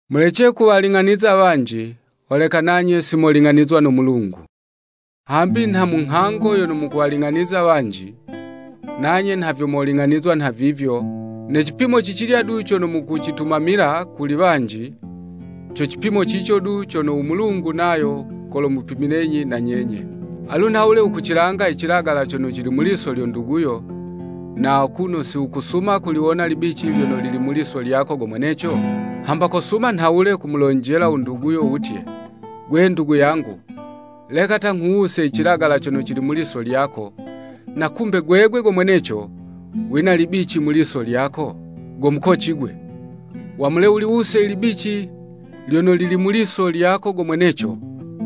“Mulece kuwaling'aniza wanji, holeka nanye simoling'anizwa no Mulungu, hambi nha mu nghango yono mukuwaling'aniza wanji, nanye nha vyo moling'anizwa nhavivyo, ne cipimo ci cilya du cono mukucitumamila kuli wanji, co cipimo cico du cono u Mulungu nayo kolomupimilenyi na nyenye. Alu nhawule wukucilanga icilagala cono cili mu liso lyo nduguyo, na akuno si wukusuma kuliwona ilibici lyono lili mu liso lyako go mweneco? Hamba kosuma nhawule kumulonjela u nduguyo wutye, ‘Gwe ndugu yangu, leka ta nghuwuse icilagala cono cili mu liso lyako,’ na kumbe gwegwe go mweneco, wina libici mu liso lyako? Go mukoci gwe! Wamule wuliwuse ilibici lyono lili mu liso lyako go mweneco,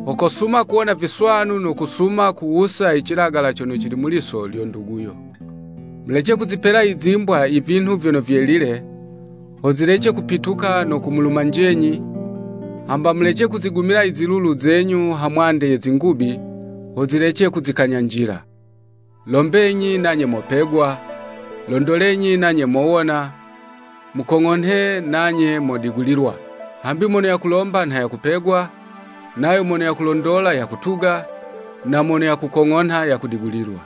ho kosuma kuwona viswanu no kusuma kuwusa icilagala cono cili mu liso lyo nduguyo. “Mulece kuzipela izimbwa ivinhu vyono vyelile, ho zilece kupituka no kumulumanjenyi, hamba mulece kuzigumila izilulu zenyu ha mwande ye zingubi, ho zilece kuzikanyanjila.” “Lombenyi nanye mopegwa, londolenyi nanye mowona, mukong'onhe nanye modigulilwa. Hambi mono yakulomba nha yakupegwa, nayo mono yakulondola yakutuga, na mono yakukong'onha yakudigulilwa.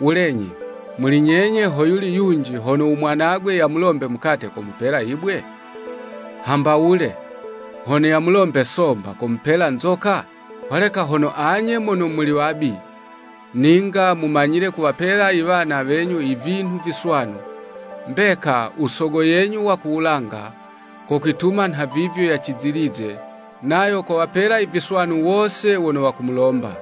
Wulenyi, muli nyenye hoyuli yunji hono u mwanagwe yamulombe mukate komupela yibwe? Hamba wule, hono yamulombe somba, komupela nzoka? Holeka hono anye mono muli wabi, ninga mumanyile kuwapela iwana wenyu ivinhu viswanu, mbeka, u Sogo yenyu wa ku wulanga kokwituma nhavivyo yacizilize, nayo kowapela iviswanu wose wono wakumulomba.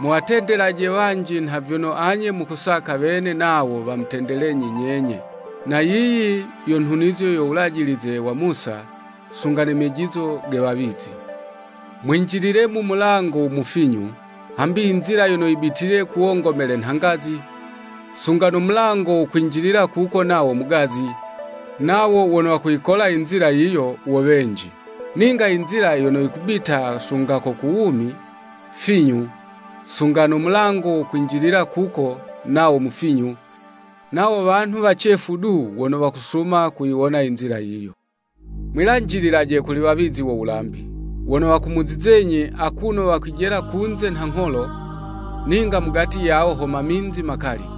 Muwatendelaje wanji nha vyono anye mukusaka wene nawo wamutendelenyi nyenye. Na yiyi yo nhunizo yo wulajilize wa Musa, sunga ne mejizo ge wawizi.” “Mwinjilile mu mulango u mufinyu. Hambi inzila yono yibitile ku wongomele nha ngazi, sunga no mulango wo kwinjilila kuko nawo mugazi, nawo wono wakuyikola inzila yiyo, wo wenji. Ninga inzila yono yikubita sunga ko ku wumi, finyu, sunga no mulango wo kwinjilila kuko nawo mufinyu, nawo wanhu wacefu du wono wakusuma kuyiwona inzila yiyo.” “Mwilanjililaje kuli iwawizi wo wulambi. Wono wakumuzizenyi, akuno wakwijela kunze nha ngholo, ninga mugati yawo ho maminzi makali.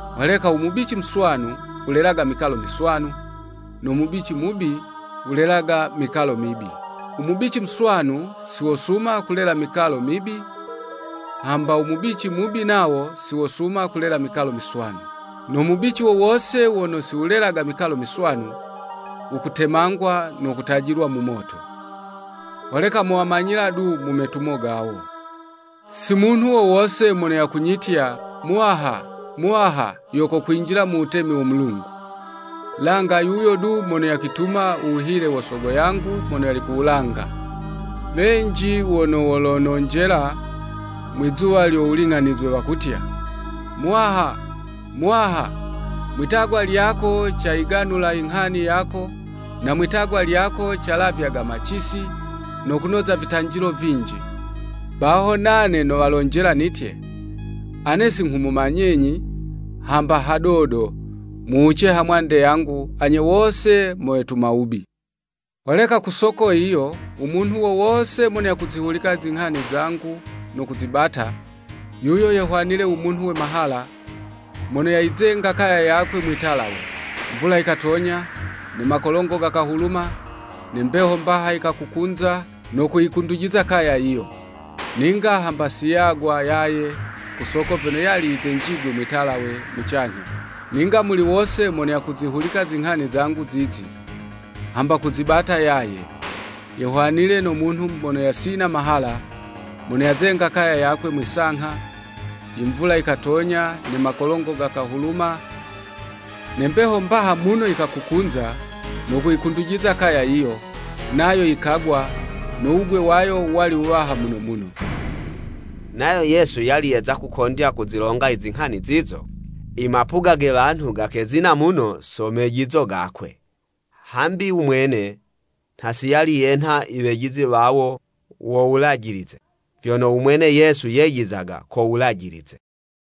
Holeka u mubici muswanu wulelaga mikalo miswanu, no mubici mubi wulelaga mikalo mibi. “U mubici muswanu si wosuma kulela mikalo mibi, hamba u mubici mubi nawo siwosuma kulela mikalo miswanu. No mubici wo wose wono si wukulela mikalo miswanu, wukutemangwa no kutajilwa mu moto. Holeka mowamanyila du mu metumo gawo.” “Si munhu wo wose mono yakunyitya, ‘Muwaha, Muwaha,’ yo kokwinjila mu wutemi wo Mulungu, langa yuyo du mono yakwituma u wuhile wo Sogo yangu mono yali ku wulanga. Wenji wono wolononjela mwizuwa lyo wuling'anizwe wakutya, ‘Muwaha, Muwaha! Mwi'tagwa lyako, cayiganulaga inghani yako, na mwi'tagwa lyako calavyaga macisi, no kunoza vitanjilo vinji.’ Baho nane nowalonjela nitye, ‘Ane si nghumumanyenyi hamba hadodo, muwuce ha mwande yangu anye wose mo wetuma wubi.’” “Holeka ku soko yiyo, u munhu wo wose mono ya kuzihulika zinghani zangu no kuzibata, yuyo yehwanile u munhu we mahala, mono yayizenga kaya yakwe mwi'talawe. Mvula yikatonya, ne makolongo gakahuluma, ne mbeho mbaha yikakukunza no kuyikundujiza kaya yiyo. Ninga hamba si yagwa yaye ku soko vyono yali yizenjigwe mwi'talawe mucanyha. Ninga muli wose mono yakuzihulika zinghani zangu zizi, hamba kuzibata, yuyo yehwanile no munhu mono yasina mahala, mono yazenga kaya yakwe mwi'sangha. Imvula yikatonya ne makolongo gakahuluma, ne mbeho mbaha muno yikakukunza, no kuyikundujiza kaya yiyo, nayo yikagwa, no wugwe wayo wali wuwaha muno muno.” Nayo Yesu yali yeza kukondya kuzilonga izinghani zizo, imapuga ge wanhu gakezina muno so mejizo gakwe. Hambi u mwene nha si yali yenha iwejizi wawo wo Wulajilize, vyono u mwene Yesu yejizaga ko wulajilize.